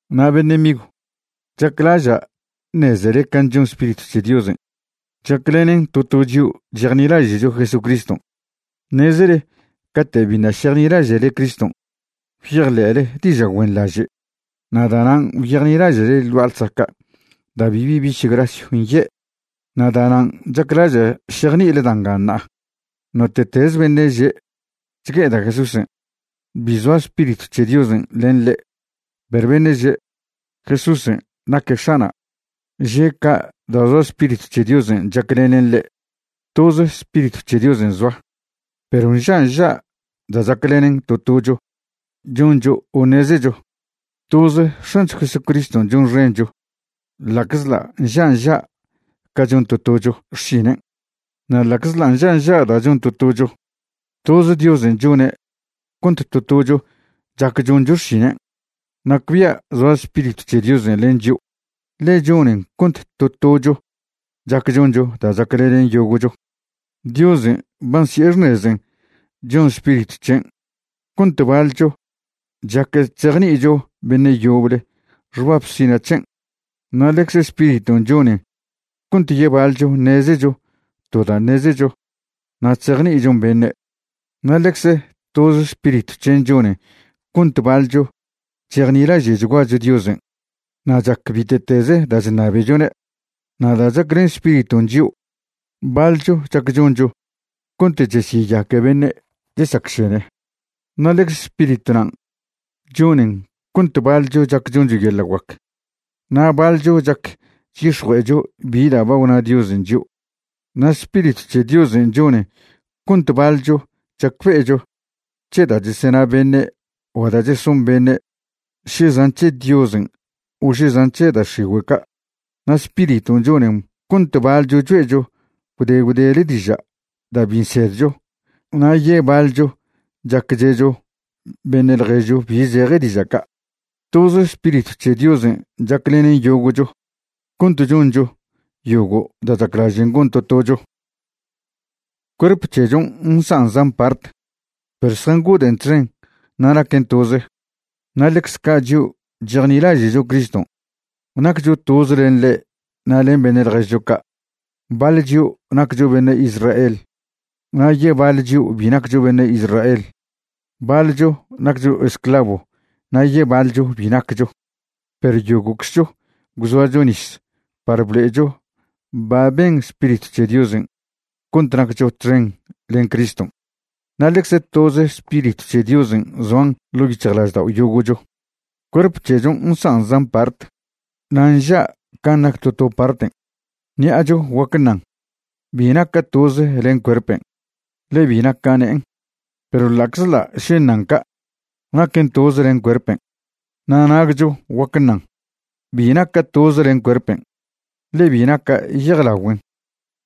Na' beṉe' migw, chaclaža' ṉezele ca chon Spiritw c̱he Diosen' chaclenen to to chio' chejnilaže'cho Jesucriston'. Ṉezele cate' biṉa' šejnilaže'le Criston' gwyejḻe'le diža' güenḻaže' na' da'nan' gwyejnilaže'le ḻ gua'a ḻsaca' da' bibi biš grasyw nye'. Na' da'nan' chaclaža' šejni'ile da' nga ṉa'a. Note'teze beṉe' že': “Chgue'eda' Jesúsen'”, bi zoa Spiritw c̱he Diosen' len ḻe', perw beṉe' že': “Jesúsen' naque X̱ana'”, že' ca' da' zoa Spiritw c̱he Diosen' chaclenen ḻe'. Toz Spiritw c̱he Diosen' zoa, perw nža' nža' da' chaclenen to tocho choncho o ṉezecho. Toz X̱ancho Jesucriston' chonxencho ḻa'czḻa' nža' nža' ca chon to tocho xšinen'. Na' ḻa'czḻa' nža' nža' da' chon to tocho, toz Diosen' chone' cont to tocho chac choncho xšinen'. Nacbia' zoa Spiritw c̱he Diosen' len chio', ḻe chonen cont to tocho chac choncho da' chaclenen yogo'cho. Diosen' ba nsi'e xṉezen' chon Spiritw c̱hen' cont baḻcho chac chzejni'icho beṉe' yoble xbab sina' c̱hen', na' ḻecze Spiriton' chonen cont yebaḻcho ṉezecho to da' ṉezecho na' chzejni'ichon beṉe'. Na' ḻecze toz Spiritw c̱hen' chonen cont baḻcho chejnilaže'chguacho Diosen' na' chac bite'teze da' chṉabechone'. Na' da' chaclen Spiriton' chio', baḻcho chac choncho cont chesyeyaque beṉe' chesacšene. Na' ḻecze Spiritw nan' chonen cont baḻcho chac choncho yeḻa' guac, na' baḻcho chac chyix̱jue'echo bi da' ba gwna Diosen' chio'. Na' Spiritw c̱he Diosen' chonen cont baḻcho chacbe'echo c̱he da' chesena beṉe' o da' cheson beṉe' še zan' c̱he Diosen' o še zan' c̱he da' x̱igüe' ca', na' Spiriton' chonen cont baḻcho choe'cho gwde gwdele diža' da' bi nsedcho, na' yebaḻcho chac che'cho beṉe' ḻježcho bi zeje diža' ca'. Toz Spiritw c̱he Diosen' chaclenen yogo'cho cont choncho yogo' da' chaclažen' gon to tocho. Cuerp c̱hechon' nsan' zan part, perw zjangoden' txen na' naquen toze. Na' ḻecze ca' chio' chejnilaže'cho Criston' naccho toze len ḻe' na' len beṉe' ḻježcho ca'. Baḻ chio' naccho beṉe' Israel na' yebaḻ chio' bi naccho beṉe' Israel. Baḻcho naccho esclavo na' yebaḻcho bi naccho. Perw yogo'czcho gwzoacho nis par blo'echo ba ben Spiritw c̱he Diosen' cont naccho txen len Criston', na' ḻecze toze Spiritw c̱he Diosen' zoan ḻo' yic̱hjlaždao' yogo'cho. Cuerp c̱hechon' nsan' zan part, na' nža' can' nac to to parten'. Ṉi'acho guac ṉan: “Bi naca' toze len cuerpen', ḻe bi naca' ne'en.” Perw ḻa'czḻa' še ṉan ca', naquen toze len cuerpen'. Na' nagcho guac ṉan: “Bi naca' toze len cuerpen', ḻe bi naca' yejlagüen'.”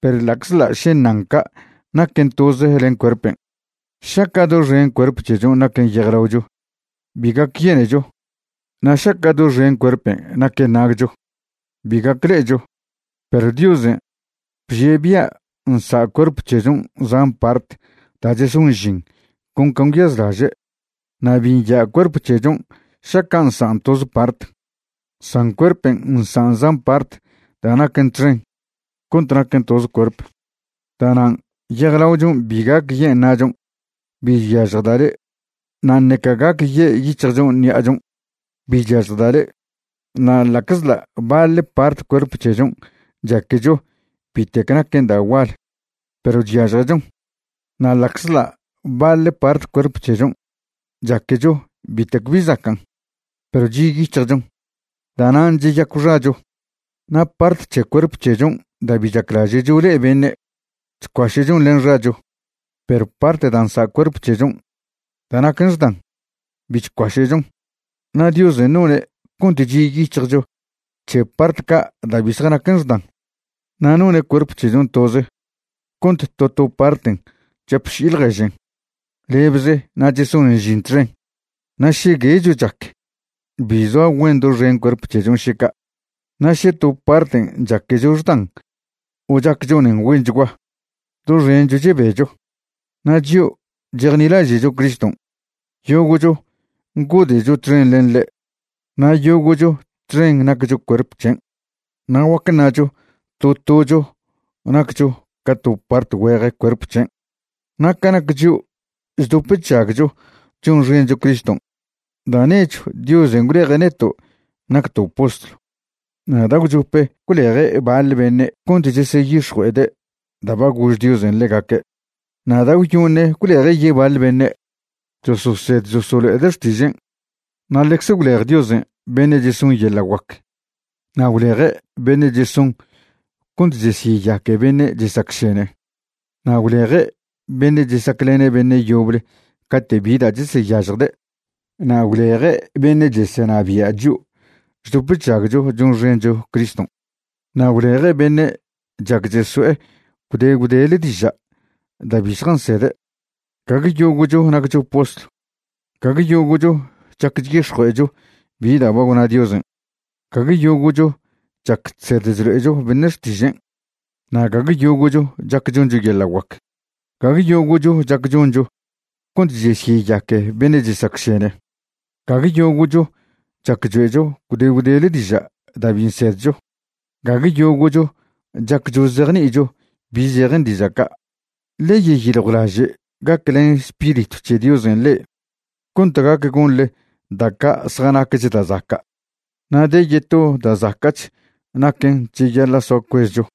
Perw ḻa'czḻa' še ṉan ca', naquen toze len cuerpen'. Šaca' doxen cuerp c̱hechon' naquen yejlaocho, bi gac yenecho. Na' šaca' doxen cuerpen' naquen nagcho, bi gac ḻe'echo. Perw Diosen' bžie' bia' nsa' cuerp c̱hechon' zan part da' cheson žin con can' gwyazlaže'. Na' bi nya' cuerp c̱hechon' šaca' nsan' toze part. San cuerpen' nsan' zan part da' naquen txen cont naquen toze cuerp. Da'nan' yejlaochon' bi gac yen' na'chon': “Bi chyažjda' le'.” Na' ṉeca gac ye' yic̱hjchon' ṉi'achon': “Bi chyažjda' le'.” Na' ḻa'czḻa' baḻ part cuerp c̱hechon' chaquecho bitec naquen da' gual, perw chyažjechon. Na' ḻa'czḻa' baḻ part cuerp c̱hechon' chaquecho bitec bi zacan', perw chi' yic̱hjchon, da'nan' cheyacw xacho. Na' part c̱he cuerp c̱hechon' da' bi chaclaže'cho le'e beṉe', chcuaše'chon len xacho. Perw part da' nsa' cuerp c̱hechon' da' naquen xdan, bi chcuaše'chon. Na' Diosen' none' cont chi' yic̱hjcho c̱he part ca' da' bi zjanaquen xdan. Na' none' cuerp c̱hechon' toz cont to to parten' chapši'i ḻježen lebze na' chesonen žin txen. Na' še guecho chac, bi zoa güen doxen cuerp c̱hechon' še ca'. Na' še to parten' chaquecho xdan o chac chonen güenchgua, doxencho chebecho. Na' chio' chejnilaže'cho Criston', yogo'cho ngode'cho txen len ḻe' na' yogo'cho txen naccho cuerp c̱hen', na' guac ṉacho to tocho naccho ca to part güeje cuerp c̱hen'. Na' ca nac chio' chdop chžagcho chonxencho Criston', da' nechw Diosen' gwleje' neto' nacto' postlw, na' da' gwchope gwleje' baḻ beṉe' cont cheseyix̱jue'ede' da' ba gož Diosen' ḻegaque'. Na' da' gwyoṉe gwleje' yebaḻ beṉe' chososed cheselo'ede' xtižen'. Na' ḻecze gwlej Diosen' beṉe' cheson yeḻa' guac, na' gwleje' beṉe' cheson cont chesyeyaque beṉe' chesacšene, na' gwleje' beṉe' chesaclene' beṉe' yoble cate' bi da' cheseyažjde'. Na' gwleje' beṉe' chesenabia' chio' chdop chžagcho chonxencho Criston', na' gwleje' beṉe' chac cheso'e gwde gwdele diža' da' bi zjansede'. Gague yogo'cho naccho postlw. Gague yogo'cho chac chyix̱jue'echo bi da' ba gwna Diosen'. Gague yogo'cho chac chsed chlo'echo beṉe' xtižen', na' gague yogo'cho chac choncho yeḻa' guac. Gague yogo'cho chac choncho cont chesyeyaque beṉe' chesacšene. Gague yogo'cho chac choe'cho gwde gwdele diža' da' bi nsedcho. Gague yogo'cho chac chozejni'icho bi zejen diža' ca'. Ḻe yeyiljwlaže' gaclen Spiritw c̱he Diosen' le'e cont gac gonḻe da' ca' zjanacch da' zaca'. Na' de yeto da' zaca'ch naquen' cheyaḻa' soa cuezcho.